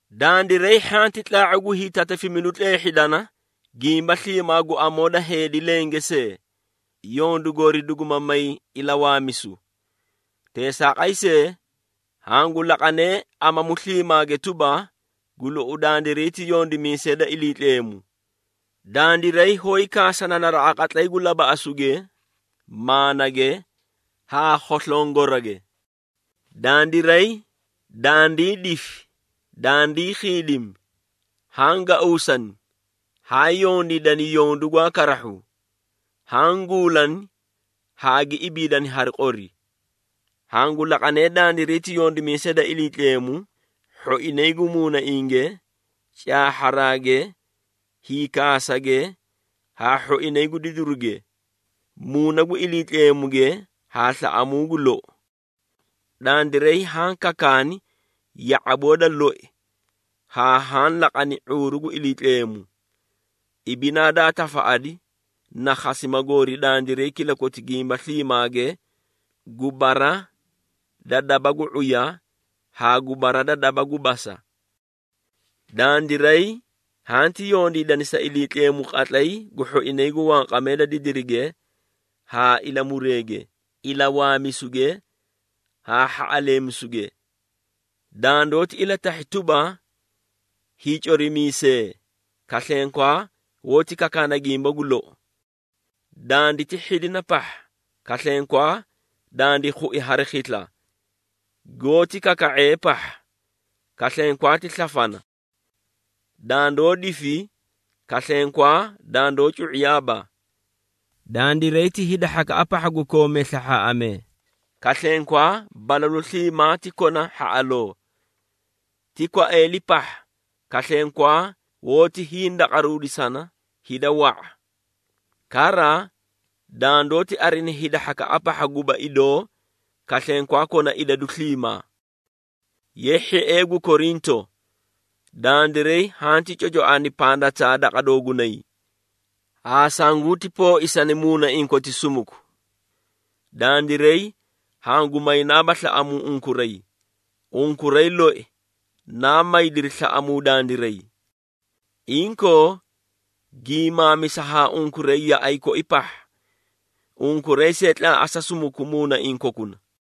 Dandiray hhanti tlaa⁄u gu hiitatafimidu tleehhidana gimba sliimaa gu amoo da heedi lenge see, yondu goori duguma may ilawaamisu. Teesaaqay see, hangu laqanee amamu sliimaage tuba, gu lou dandiray ti yondimiisee da Iliitleemu. Dandiray hoóyi kaasana naraꞌa qatlay gu labaꞌasuge, maanage, haa khoslongorage. Dandiray dandii difi, dandii khiidimi, haã gauusani, haã yondiidani yondu gwaa karahhu, haã guulani haa gi ibiidani hari qori. Hangu laqanee dandiray ti yondimiisee da Iliitleemu, hhoinay gu muunainge, caahharaage, hiikaasage haa hhoinay gu didiruge, Muuna gu Iliitleemuge haa slaꞌamuu gu lou. Dandiray haã kakaani ya⁄aboo da loi haa haã laqani ⁄uuru gu Iliitleemu. Ibinaa daa tafaꞌadi na khasima goori dandiray kilakoti gimba sliimaage gu bara da daba gu ⁄uya haa gu bara da daba gu basa. Dandiray hanti yondiidani sa Iliitleemu qatlay gu hhoinay gu wanqamee da didirige haa ilamureege, ilawaamisuge haa hhaꞌaleemisuge. Dandoóti ilatahhi tuba, hiicorimiisee, kaslenkwaa hoóti kakaana gimba gu lou. Danditi hhidina pahha, kaslenkwaa dandi khui hari khisla. Goóti kaka⁄ee pahha, kaslenkwaa ti slafana. Dandoó difi kaslenkwaa dandoó cu⁄iyaaba. Dandiray ti hida hhakaꞌa pahha gu koomee slahhaaꞌamee, kaslenkwaa balalu sliimaa ti kona hhaꞌaloo. Ti kwaeeli pahha, kaslenkwaa hoótii hindaqaruudisana hida wa⁄a. Kara, dandoóti arina hida hhakaꞌa pahha guba idoo, kaslenkwaa kona idadu sliimaa. Ye hhiee gu Korinto! Dandiray hanti cocoani pandataa daqa doogunay, haa sanguti pooisani muunaiĩ koti sumuku. Dandiray hangu maynaaba slaꞌamuu unkuray, unkuray loi naa maydiri slaꞌamuu dandiray. Inkoo, gimaamisa haa unkuray yaꞌay koi pahha. Unkuray see tlaaꞌasa sumuku muunaiĩ kokuna.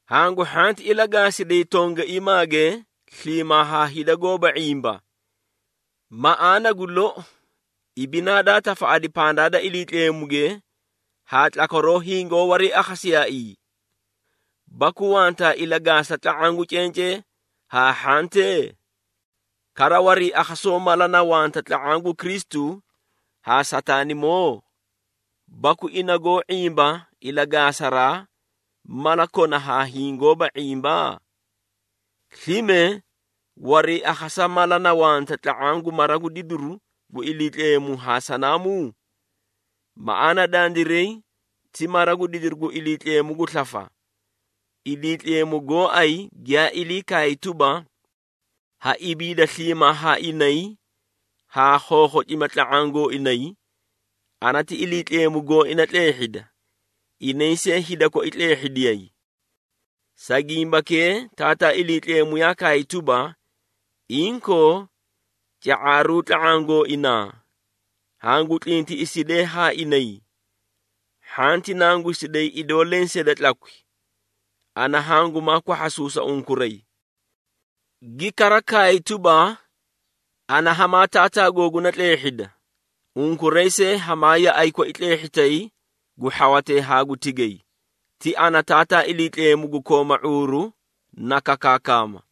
Hangu hhanti ilagaasiday tongaiimaage sliimaa haa hida goóba ⁄imba. Maꞌaana gu lou, ibinaa daa tafaꞌadi pandaa da Iliitleemuge haa tlakwaroo hingoó wariiakhasiyaaii? Baku wantaa ilagaasa tla⁄aã da cencee haa hhantee? Kara, wariiakhasoo mala na wanta tla⁄aã gu Kristu haa Sataanimoo? Baku ina goó ⁄imba ilagaasaraa mala kona haa hiĩ goóba ⁄imba? Slime, wariiakhasa mala na wanta tla⁄aã gu mara gu didiru gu Iliitleemu haa sanaamuu? Maꞌaana dandiray ti mara gu didiru gu Iliitleemu gu slafa. Iliitleemu gooay giyaa ilii kaay tuba, “Ha ibiida sliimaa haa inay haa khookhocima tla⁄aã gooinay, ana ti Iliitleemu gooina tleehhida, inay see hida koi tleehhidiyay.” Sa gimbakee Taataa Iliitleemu yaa kaay tuba, “Inkoo, ca⁄aruu tla⁄aã gooinaa, hangu tlintiꞌisidee haa inay. Hhanti nangusiday idoo lensee da tlakwi, ana hangumaa kwahhasuusa unkuray.” Gi kara kaay tuba, “Ana hamaa Taataa googuna tleehhida, unkuray see hamaa yaꞌay koi tleehhitay gu hhawatee haa gu tigay, ti ana Taataa Iliitleemu gu kooma ⁄uuru na kakaakama.”